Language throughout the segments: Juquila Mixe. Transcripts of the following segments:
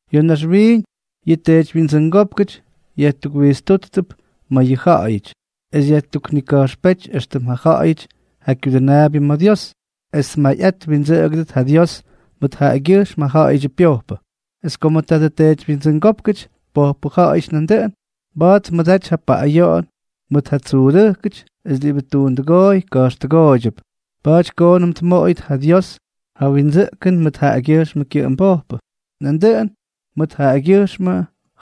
Ya̱ naxwiiñ yʉ teedywyindsʉngópkʉty yajtukwijtstútp ma̱ yʉ ja̱ꞌa̱yʉty, es yajtuknika̱jxpéty éxtʉm ja ja̱ꞌa̱yʉty ja kyudʉnaabyʉ ma̱ Dios, es tmayꞌat twindsʉꞌʉgʉt ja Dios mʉt jaꞌagyʉjxm ja ja̱ꞌa̱yʉdyʉ pyojpʉ. Es komʉ tadʉ teedywyindsʉngópkʉty pojpʉ ja̱ꞌa̱yʉty nandʉꞌʉn, mba̱a̱t tmʉdaty ja paꞌꞌayoꞌon mʉt ja tsuudʉjkʉty es diꞌibʉ tuundʉgooy ka̱jxtʉgooydyʉp, pa̱a̱ty koonʉm tmoꞌoyʉt ja Dios ja windsʉꞌkʉn mʉt jaꞌagyʉjxmʉ kyʉꞌʉmbojpʉ, nandʉꞌʉn mʉt jaꞌagyʉjxmʉ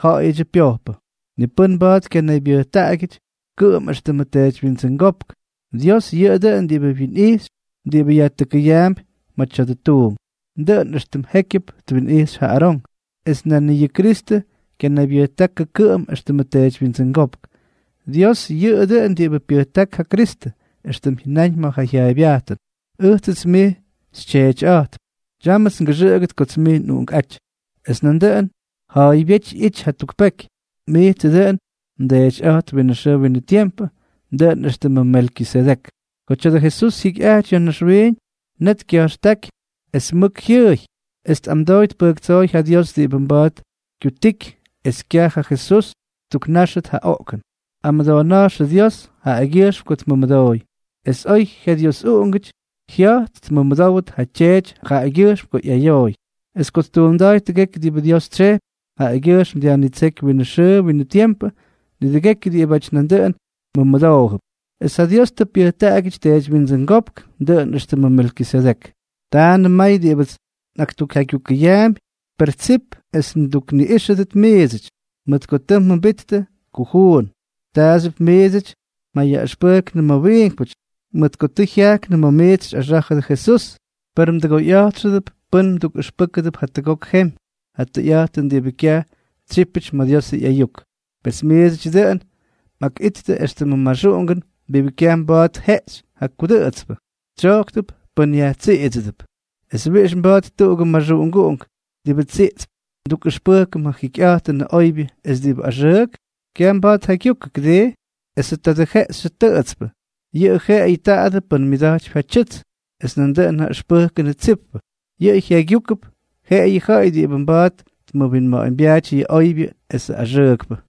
ja̱ꞌa̱yʉdyʉ pyojpʉ. Ni pʉ́n mba̱a̱t kyanaybyʉjtaꞌagyʉty kʉꞌʉm éxtʉmʉ teedywyindsʉngópk, Dios yʉꞌʉ dʉꞌʉn diꞌibʉ wyinꞌijxypy diꞌibʉ yajtʉkʉyaampy ma̱ tya̱dʉ tuunk, dʉꞌʉn éxtʉm jékyʉp twinꞌijxy ja Arón. Es nan ni yʉ Kristʉ kyanaybyʉjtákʉ kʉꞌʉm éxtʉmʉ teedywyindsʉngópk, Dios yʉꞌʉ dʉꞌʉn diꞌibʉ pyʉjták ja Kristʉ, éxtʉm jyʉnáñ ma̱ jyaaybyajtʉn: Ʉjts mij xyTyeetyꞌa̱jtp. Tyámʉts ngʉxʉꞌʉgʉt kots mij nꞌUꞌunkꞌáty. Es nandʉꞌʉn ja̱a̱ybyéty ꞌyity jatuk peky: Mijtsʉ dʉꞌʉn mdeetyꞌa̱jtp winʉ xʉʉ winʉ tiempʉ, dʉꞌʉn éxtʉmʉ Melkisedek. Ko tya̱dʉ Jesús jyikyꞌajty ya̱ naxwiiñ, net kya̱jxtáky es mʉk jyʉʉy, es tꞌamdooy tpʉjktsooy ja Dios diꞌibʉ mba̱a̱t kyutiky es kyaj ja Jesús ttuknáxʉt ja oꞌkʉn. Amʉdoona̱jxʉ Dios jaꞌagyʉjxm ko tmʉmʉdooy. Es oy jyaDiosꞌuꞌungʉty, jya̱jt tmʉmʉdówʉt ja Tyeety jaꞌagyʉjxm ko ꞌyayooy; es ko ttuunda̱a̱y tʉgekyʉ diꞌibʉ Dios tsyejpy, jaꞌagyʉjxm dyajnitséky winʉ xʉʉ winʉ tiempʉ nidʉgekyʉ diꞌibáty nandʉꞌʉn mʉmʉdoojʉp, es ja Dios tʉ pyʉjtaꞌagyʉty teedywyindsʉngópk, dʉꞌʉn éxtʉmʉ Melkisedek. Taanʉm may diꞌibʉts nꞌaktukjaygyukʉyaampy, per tsip es ndukniꞌíxʉdʉt miidsʉty, mʉt ko tʉ mjʉmbittʉ kujuun. Taaxyʉp miidsʉty mjayaꞌʉxpʉjknʉ ma̱ wiinkpʉty, mʉt ko tʉ jyajknʉ ma̱ miits xyꞌaxá̱jʉdʉ Jesús; per mdʉgoyꞌa̱jtxʉdʉp pʉ́n mdukꞌʉxpʉ́kʉdʉp jatʉgok jemy ja tʉyꞌa̱jtʉn diꞌibʉ kyaj tsyípʉty ma̱ Diosʉ ꞌyayuk. Pes miidsʉty dʉꞌʉn mꞌakꞌittʉ éxtʉmʉ maxuꞌungʉn diꞌibʉ kyaj mba̱a̱t tjeꞌxy ja kudʉꞌʉtspʉ, tsyojktʉp pʉ́n yajtsiꞌidsʉdʉp. ¿Es wiꞌix mba̱a̱t tuꞌugʉ maxuꞌunguꞌunk diꞌibʉ tsiꞌtsp ndukꞌʉxpʉjkʉm ja jikyꞌa̱jtʉnʉ oybyʉ es diꞌibʉ axʉʉk? Kyaj mba̱a̱t tjaygyukʉ, ¿kʉdii? Esʉ tadʉ jeꞌxyʉ tʉꞌʉtspʉ, yʉꞌʉ jeꞌeyʉ taadʉ pʉ́n myʉda̱jtypy ja tyʉts; es nandʉꞌʉn ja ʉxpʉjkʉnʉ tsippʉ, yʉꞌʉ jyaygyujkʉp jeꞌeyʉ ja ja̱ꞌa̱y diꞌibʉ mba̱a̱t tmʉwinma̱ꞌa̱ñbyaaty yʉ oybyʉ esʉ axʉʉkpʉ.